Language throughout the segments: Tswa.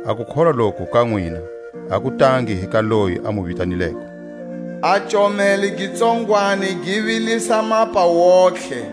A kukholwa loku ka nwina a ku tangi hi ka loyi a mu vitanileko. A comelo gi tsongwani gi vilisa mapa wontihe.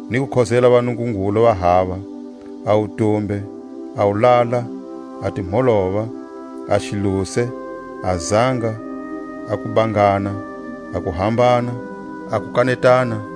Ni ku khozela vanungungulu va hava, a wutumbe, a wulala, a timholova, a xiluse, a zanga, a kubangana, a kuhambana, a kukanetana,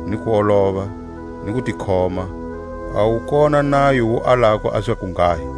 ni kuolova, hi kutikhoma; a wu kona nayo wu alako a zakunghahi.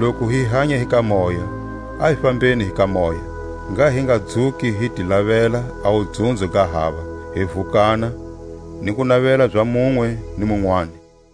Loku hi hanya hi ka Moya, a hi fambeni hi ka Moya. Ngha hi nga dzuki hi ti lavela a wudzunzo ga hava, hi vukana, ni ku navela za munwe ni munwani.